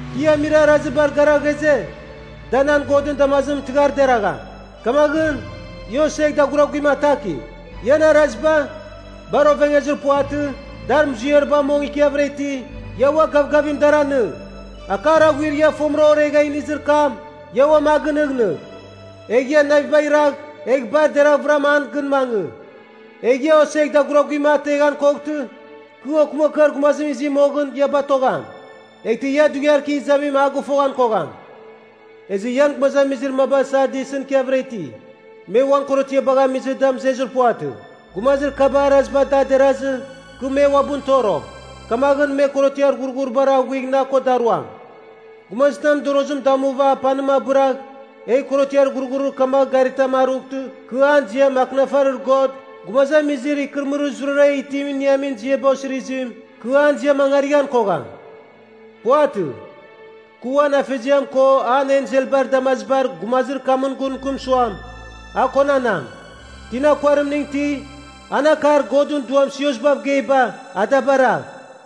Kɨ ia amir arazibar gara ghaze, da nan Godɨn damazimɨn tɨghar deragham. Kamaghɨn, ia osegh daguraguim atakigh. Ian araziba, bar ovengezir puvatɨ, dar muziariba mong ikiavɨra iti, ia ua gavgavim dar anɨng. Akar aghuir ia fomɨram oregha inizir kam, ia uam a gɨnɨghnɨgh. Egh ia navibagh iragh, egh bar deravɨram an gɨn mangɨ. Egh ia osegh daguraguim ateghan koghtɨ, kɨ okɨmakɨar gumazim izi moghɨn, ia batogham. Eghtɨ ia dughiar kɨ izamim a gɨfoghan kogham. Ezɨ ian gumazamizir maba Sardisɨn ikiavɨra iti, me uan korotiabagh amizɨ da mɨzezir puvatɨ. Gumazir kabar araziba da derazɨ, kɨ me uabɨn toro, kamaghɨn me korotiar ghurghuribar aghuigh na ko daruam. Gumazitam mɨdorozim damuva apanim abɨragh, egh korotiar ghurghurir kamagh garitam arughtɨ kɨ an ziam akɨnafarir God gumazamizir ikɨrɨmɨrir zurara itim iniamin ziaba osirizim, kɨ an ziam angarighan kogham. Puvatɨ. Kɨ uan afeziam ko an enselbar damazibar gumazir kamɨn gun mɨkɨm suam, a konanam. Tina kuarimning iti, an akar Godɨn Duam siosbav geiba, a da baragh.’”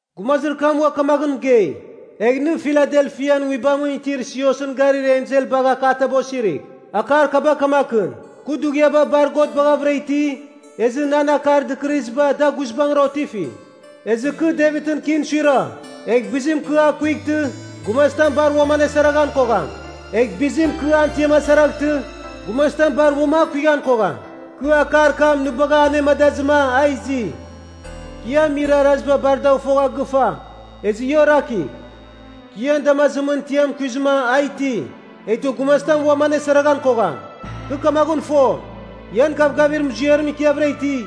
Gumazir kam ua kamaghɨn mɨgei, “Egh nɨ Filadelfian nguibamɨn itir siosɨn garir ensel bagh akataba osirigh. Akar kaba kamakɨn, ‘Kɨ dughiaba bar God baghavɨra iti, ezɨ nan akar dɨkɨrɨziba da guizbangɨra otifi. Ezɨ kɨ Devitɨn kin suira, egh bizim kɨ a kuightɨ, gumazitam bar uam anesaraghan kogham. Egh bizim kɨ an tiam asaraghtɨ, gumazitam bar uam a kuighan kogham. Kɨ akar kam nɨ bagha anemadazɨma a izi. Kɨ ia amir araziba bar dagh fogha gɨfa, ezɨ ia orakigh. Kɨ ian damazimɨn tiam kuizɨma a iti. Eghtɨ gumazitam uam anesaraghan kogham. Kɨ kamaghɨn fo, ian gavgavir muziarim ikiavɨra iti,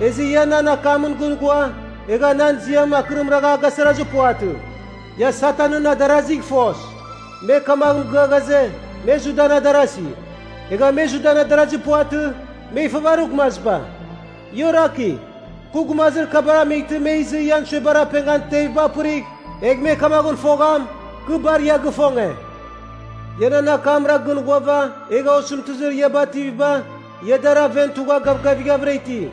ezɨ ia nan akamɨn gɨn ghua, egha nan ziam akɨrim ragha a gasarazir puvatɨ. Ia Satanɨn adarazigh fos, me kamagh mɨgɨa ghaze, me Judan adarasi. Egha me Judan adarazi puvatɨ, me ifavarir gumaziba. Ia orakigh. Kɨ gumazir kabar amightɨ me izɨ ian suebar apengan teviba apɨrigh, egh me kamaghɨn fogham, kɨ bar ia gifonge. Ia nan akamra gɨn ghuava egha osɨmtɨzir ia bativiba ia dar aven tugha gavgavighavɨra iti.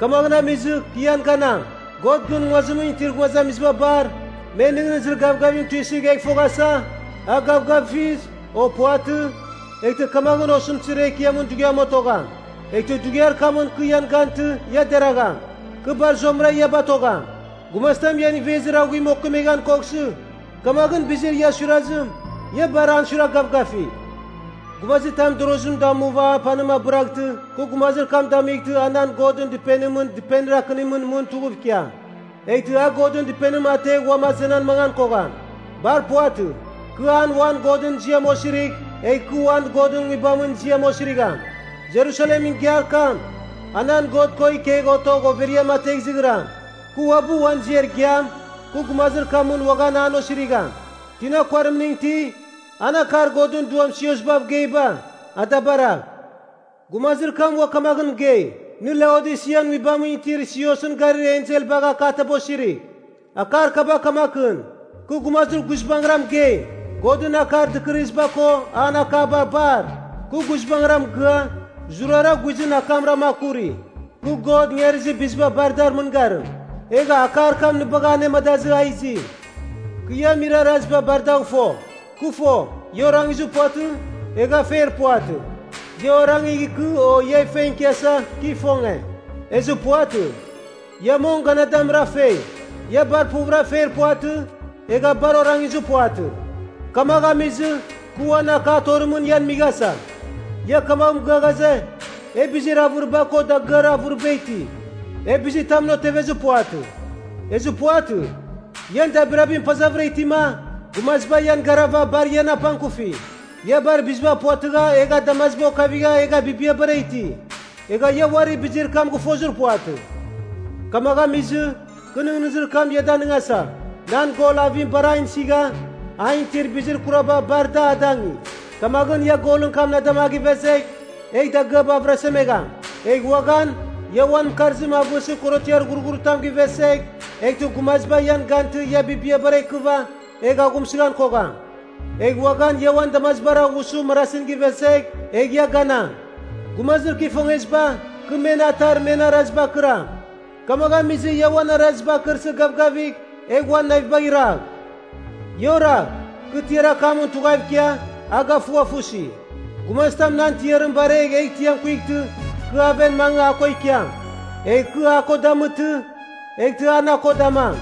Kamagh amizɨ, kɨ ian ganam. God gɨn nguazimɨn itir gumazamiziba bar, men nɨghnɨzir gavgavim tuisɨgh egh foghasa, a gavgafiz, o puvatɨ, eghtɨ kamaghɨn osɨmtɨzir ekiamɨn dughiam otogham. Eghtɨ dughiar kamɨn kɨ ian gantɨ ia deragham. Kɨ bar zuamɨra ia batogham. Gumazitam ian ivezir aghuim okemeghan koghsɨ, kamaghɨn bizir ia suirazim, ia bar an suiragh gavgafigh. Gumazitam mɨdorozim damuva apanim abɨraghtɨ, kɨ gumazir kam damightɨ a nan Godɨn Dɨpenimɨn dɨpenir akɨnimɨn mɨn tughuv ikiam. Eghtɨ a Godɨn Dɨpenim ategh uam azenan mangan kogham. Bar puvatɨ. Kɨ an uan Godɨn ziam osirigh, egh kɨ uan Godɨn Nguibamɨn ziam osirigham. Jerusalemɨn igiar kam, a nan God ko ikegh otogh overiam ategh izighram. Kɨ uabɨ uan ziar igiam, kɨ gumazir kamɨn uaghan an osirigham. Tina kuarimning iti, an akar Godɨn Duam siosbav geiba, a da baragh.’” Gumazir kam ua kamaghɨn mɨgei, “Nɨ Laodisian nguibamɨn itir siosɨn garir ensel bagh akataba osirigh. Akar kaba kamakɨn, ‘Kɨ gumazir “guizbangɨra” mɨgeim. Godɨn akar dɨkɨrɨziba ko an akaba bar, kɨ guizbangɨra mɨgɨa, zurara guizɨn akamrama akuri. Kɨ God ingarizir biziba bar dar mɨngarim. Egha akar kam nɨ bagha anemadazɨ a izi. Kɨ ia amir araziba bar dagh fo. Kɨ fo, ia orangizir puvatɨ, egha feir puvatɨ. Ia orangigh ikɨ o ia feng ikiasa, kɨ ifonge. Ezɨ puvatɨ. Ia mong, ganadamɨra fei. Ia bar puvɨra feir puvatɨ, egha bar orangizir puvatɨ. Kamagh amizɨ, kɨ uan akar torimɨn ian mighasa. Ia kamagh mɨgɨa ghaze, “E bizir avɨriba ko dagɨar avɨriba iti. E bizitamɨn otevir puvatɨ.” Ezɨ puvatɨ. Ian dabirabim pazavɨra itima, gumaziba ian garava bar ian apangkufi. Ia bar biziba puvatɨgha egha damaziba okavigha egha bibiabara iti. Egha ia uari bizir kam gɨfozir puvatɨ. Kamagh amizɨ, kɨ nɨghnɨzir kam ia danɨngasa. Nan gol avim bar an isigha an itir bizir kuraba bar da adangi. Kamaghɨn ia golɨn kam na dama a givezegh, egh dagɨaba avɨrasemegham. Egh uaghan ia uan mɨkarzim avɨsɨ korotiar ghurghuritam givesegh, eghtɨ gumaziba ian gantɨ ia bibiabara ikɨva, egh aghumsɨghan kogham. Egh uaghan ia uan damazibar aghusɨ marasin givesegh, egh ia ganam. Gumazir kɨ ifongeziba, kɨ men atar men arazibar kɨram. Kamagh amizɨ ia uan araziba akɨrsɨ gavgavigh egh uan navibagh iragh. Ia oragh, kɨ tiar akamɨn tughav ikia, a gafughafusi. Gumazitam nan tiarim baregh egh tiam kuightɨ, kɨ aven mangɨ a ko ikiam. Egh kɨ a ko damɨtɨ, eghtɨ a na ko damam.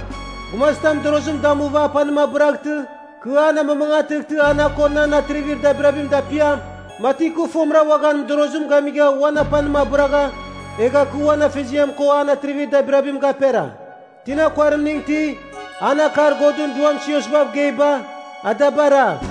Gumazitam mɨdorozim damuva apanim abɨraghtɨ, kɨ an amamangatɨghtɨ a na ko nan atrivir dabirabim dapiam, mati kɨ fomɨra uaghan mɨdorozim gamigha uan apanim abɨragha, egha kɨ uan afeziam ko an atrivir dabirabim gapera. Tina kuarimning iti, an akar Godɨn Duam siosbav geiba, a da baragh.’”